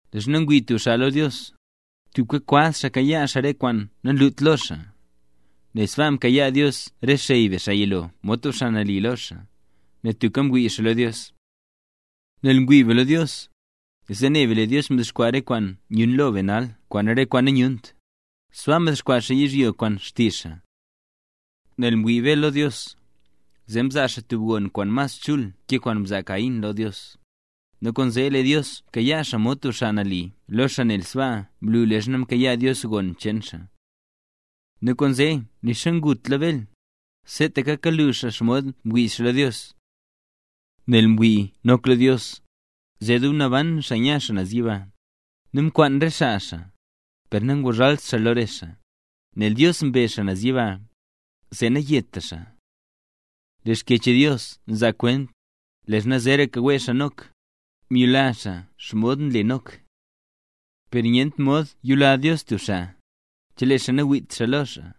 Leezha ngwii tub xaa lo Dios, tubka kwaz xaa kayaa xaa re kwaan nanlut lo xaa. Nel sbaa mkayaa Dios re xey be xaa yilo mod tub xaa nali lo xaa, nel tubka mwii xaa lo Dios. Nel ngwii be lo Dios, zee ne be lee Dios mdexkwaa re kwaan nyun lo be nal kwaan re kwaan nayunt, sbaa mdexkwaa xaa yizhyo kwaan xtizh xaa. Nel mwii Bel lo Dios, zee mzaa xaa tub gon kwaan mas chul ke kwaan mzaa Caín lo Dios, nu kwaanzee lee Dios mkayaa xaa mod tub xaa nali lo xaa nel sbaa mlu leezha mkayaa Dios gon cheen xaa. Nu kwaanzee nixa ngutla Bel, seetaka kalu xaa xomod mwii xaa lo Dios. Nel mwii Nok lo Dios, zee dub namban xaa nya xaa naz yiba, nu mkwaan re xaa xaa, per nanguzhalt xaa lo re xaa, nel Dios mbe xaa naz yiba, zee nayeta xaa. Lee Xkyech Dios nzaa kwent, leezha zeeraka wee xaa Nok, myula xaa mod nle Nok. Per nyent mod yula Dios tub xaa, chelee xaa nangwiit lo xaa.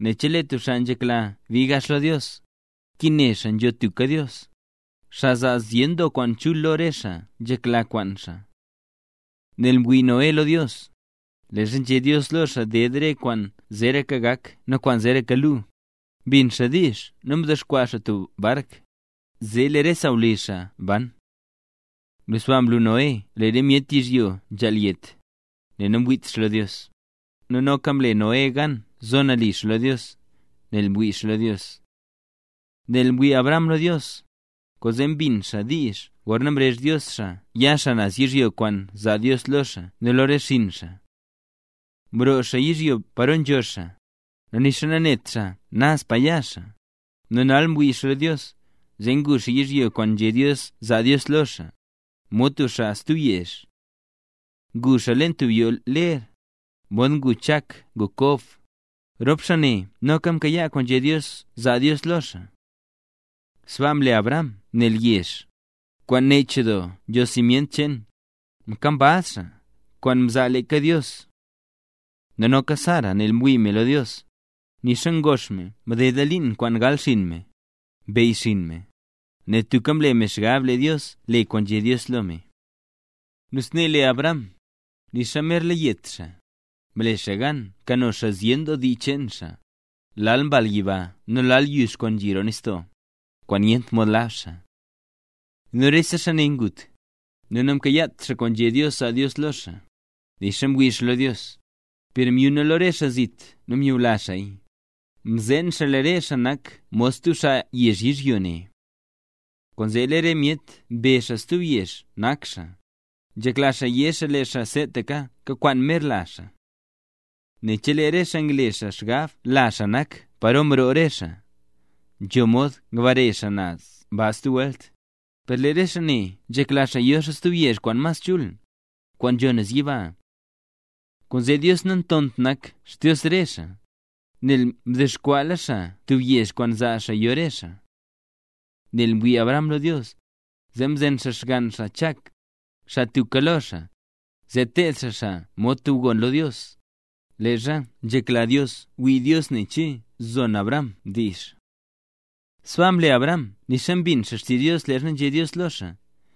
Nel chelee tub xaa nzhekla bii gax lo Dios, nkin ne xaa nzho tubka Dios, xaa zaa zyen doo kwaan chul lo re xaa nzhekla kwaan xaa. Nel mwii Noé lo Dios, leezha nzhé Dios lo xaa ded re kwaan zeeraka gak nu kwaan zeeraka lu, mbin xaa diizh nu mdexkwaa xaa tub bark, zee lee re sawlizh xaa ban. Nu sbaa mlu Noé lee re myet yizhyo nzhaal yet, nel namwiit xaa lo Dios; nu noka mle Noé gan zo nali xaa lo Dios, nel mwii xaa lo Dios. Nel mwii Abraham lo Dios, kwaanzee mbin xaa diizh gorna mrezh Dios xaa ya xaa naz yizhyo kwaan zaa Dios lo xaa nu lo re xinn xaa. Mroo xaa yizhyo paro nzho xaa, nu nixa nanet xaa naz pa ya xaa; nu nel mwii xaa lo Dios, zee ngu xaa yizhyo kwaan nzhé Dios zaa Dios lo xaa, mod tub xaa stub yezh. Ngu xaa leen tub yoo ler, modxa ngu Chak ngu Kob, rop xaa ne noka kayaa kwaan nzhé Dios zaa xaa lo xaa. Sbaa mle Abraham nel yezh, kwaan nech doo nzho simyent cheen, mkambaz xaa, kwaan mza leeka Dios. Nu noka Sara nel mwii me lo Dios, nixa ngox me nu mdedla liin kwaan gal xinn me, mbeyyxiin me, nel tubka mle me xgab lee Dios le kwaan nzhé Dios lo me. Nu snee lee Abraham, nixa merla yet xaa, mle xaa gan mkano zyen doo dii cheen xaa, lal mbal yiba nu lal yux kwaan nzhi roo nistoo, kwaan nyent mod lab xaa. Nu rese xaa ne ngut, nu namkayaat xaa kwaan nzhé Dios zaa Dios lo xaa, nixa mwii xaa lo Dios; per myuna lo re xaa zit nu nyula xaaya, mzeen xaa lee re xaa nak mod xaa stub yezh yizhyo ne. Kwaanzee lee re myet mbezh xaa stub yezh nak xaa, nzhekla xaa yé xaa lee xaa seetaka kakwaan mer lazh xaa. Nel chelee re xaa ngle xaa xgab lazh xaa nak paro mroo re xaa, nzho mod ngbare xaa naz ba stub welt; per lee re xaa ne nzhekla yo stub yezh kwaan mas chul, kwaan nzho naz yiba. Kwaanzee lee Dios nantont nak Xdios re xaa, nel mdexkwaala xaa tub yezh kwaan zaa xaa yo re xaa. Nel mwii Abraham lo Dios, zee mzen xaa xgann xaa Chak, xaa tubka lo xaa, zee teed xaa xaa mod tub gon lo Dios, leezha nzhekla Dios wii Dios nen che zon Abraham diizh. Sbaa mle Abraham nixa mbin xaa xtizh Dios leezha nzhé Dios lo xaa: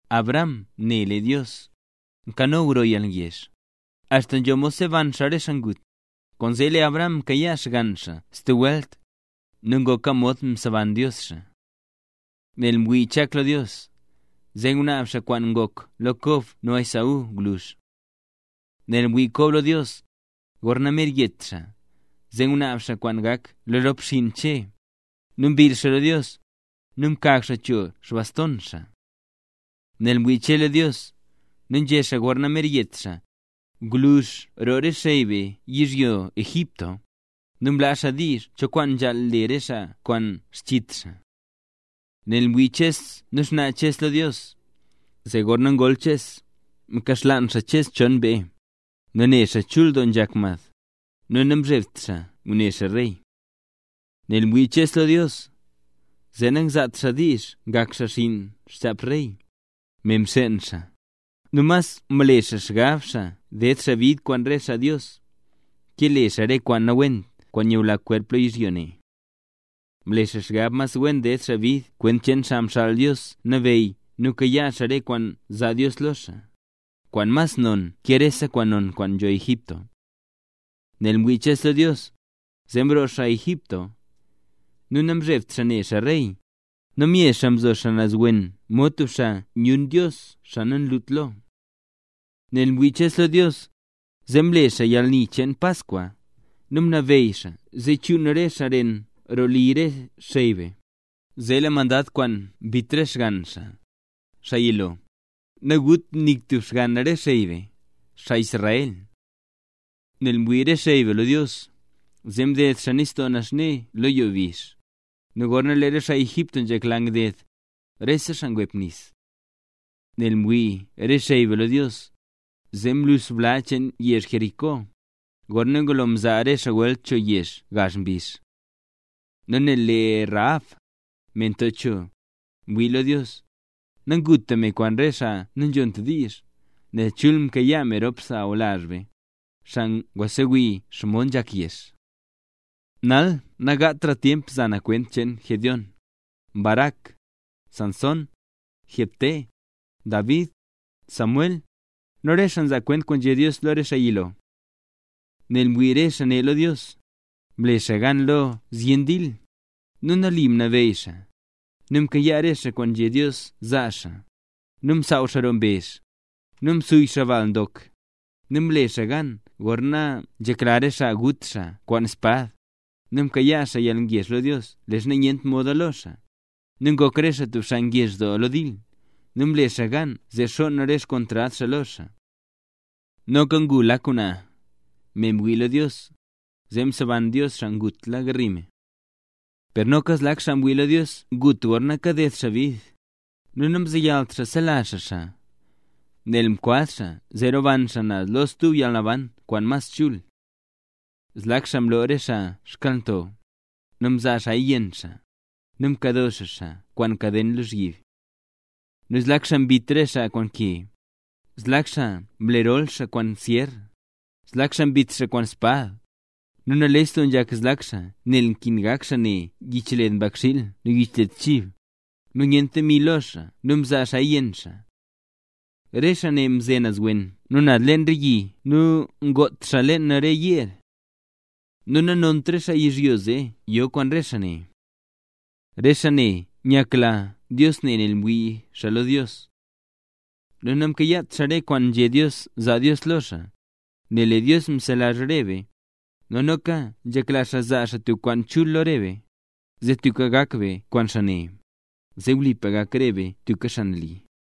Abraham ne lee Dios, nkano gro yalgezh, axta nzho mod seban xaa re xaa ngut; kwaanzee lee Abraham mkayaa xgann xaa stub welt, nu ngoka mod mseban Dios xaa. Nel mwii Chak lo Dios, zee ngunaab xaa kwaan ngok lo Kob nu Esaú gwluzh. Nel mwii Kob lo Dios, gorna mer yet xaa, zee ngunaab xaa kwaan gak lo rop xinn Che, nu mbill xaa lo Dios, nu mkag xaa cho xbaston xaa. Nel mwii Che lo Dios, nu nzhé xaa gorna mer yet xaa, gwluzh roo re xey be yizhyo Egipto, nu mlaa xaa diizh cho kwaan nzhaal le re xaa kwaan xchit xaa. Nel mwii xuz Ches nu xnaa Ches lo Dios, zee gorna ngol Ches, mkaxlaan xaa Ches chon mbee; nel ne xaa chul doo nzhak mad, nu namzhebt xaa ngune xaa rey. Nel mwii Ches lo Dios, zee nangzaat xaa diizh ngak xaa xinn xchap rey, me mxeen xaa; nu mas mle xaa xgab xaa ded xaa bid kwaan re xaa Dios, ke le xaa re kwaan nawent kwaan nyula kwerp lo yizhyo ne. Mle xaa xgab mas wen ded xaa bid kwent cheen Xaa Xaal Dios Nabeyy nu kayaa xaa re kwaan zaa Dios lo xaa, kwaan mas non ke rese kwaan non kwaan nzho Egipto. Nel mwii Ches lo Dios, zee mroo xaa yizhyo Egipto, nu namzhebt xaa ne xaa rey, nu mye xaa mzo naz wen mod tub xaa nyun Dios xaa nanlut lo. Nel mwii Ches lo Dios, zee mle xaa yalni cheen Paskwa, nu mnabeyy xaa zee chuun re xaa ren roo li rese xey be, zee lee mandad kwaan mbit re xgann xaa, xaa yilo, naguta nik tub xgann re xey be, xaa Israel. Nel mwii re xey be lo Dios, zee mded xaa Nistoo Naxne lo yo bizh; nu gorna lee re xaa Egipto nzhekla ngded, rese xaa ngwep nis. Nel mwii re xey be lo Dios, zee mluux bla cheen yezh Jericó, gorna ngulo mzaa re xaa welt cho yezh gazh mbizh. Nu nel lee Rahab, me nto cho, mwii lo Dios, nanguta me kwaan re xaa nanzhont diizh, nel chul mkayaa me rop sawlazh be, xaa ngwa ngusewii xomod nzhak yezh. Nal nagatra tyemp za na kwent cheen Gedeón, Barac, Sansón, Jefté, David, Samuel, nu re xaa mzaa kwent kwaan nzhé Dios lo lee xaa yilo. Nel mwii re xaa ne lo Dios, mle xaa gan lo zyen dil, nu nali mnabeyy xaa, nu mkayaa re xaa kwaan nzhé Dios zaa xaa, nu msaaw xaa roo mbezh, nu msuy xaa bal ndok, nu mle re xaa gan gorna nzhekla re xaa gut xaa kwaan spad, nu mkayaa xaa yalngezh lo Dios leezha nyent moda lo xaa, nu ngok re xaa tub xaa ngezh doo lo dil, nu mle xaa gan zee xonn re xkontrad xaa lo xaa. Noka ngu lak ngwnaa, nel mwii me lo Dios, zee mseban Dios xaa ngutla garli me. Per noka zlak xaa mwii lo Dios ngut gorna kaded xaa bid, nu namzeyalt xaa sela xaa xaa, nel mkwaz xaa zee roban xaa naz lo stub yalnaban kwaan mas chul. Zlak xaa mloo re xaa xkyalnto, nu mzaa xaaya yenn xaa, nu mkado xaa xaa kwaan kaden lozhyib. Nu zlak xaa mbit re xaa kwaan ke, zlak xaa mle rol xaa kwaan syer, nu zlak xaa mbit xaa kwaan espad; nu nales doo nzhak zlak xaa nel nkin gak xaa ne yichled mbakxiil nu yichled chib, nu nyent demi lo xaa nu mzaa xaaya yenn xaa. Re xaa ne mze naz wen nu naz leen re yi nu ngot xaa leen re yeer. Nu nanont re xaa yizhyo zee yo kwaan re xaa ne. Re xaa ne nyakla Dios ne nel mwii xaa lo Dios. Nu namkayaat re xaa kwaan nzhé Dios zaa Dios lo xaa; nel lee Dios mselazh re be, nu noka nzhekla xaa zaa xaa tub kwaan chul lo re be, zee tubka gak re be kwaan xaa ne, zee wlipa gak rese be tub xaa nali.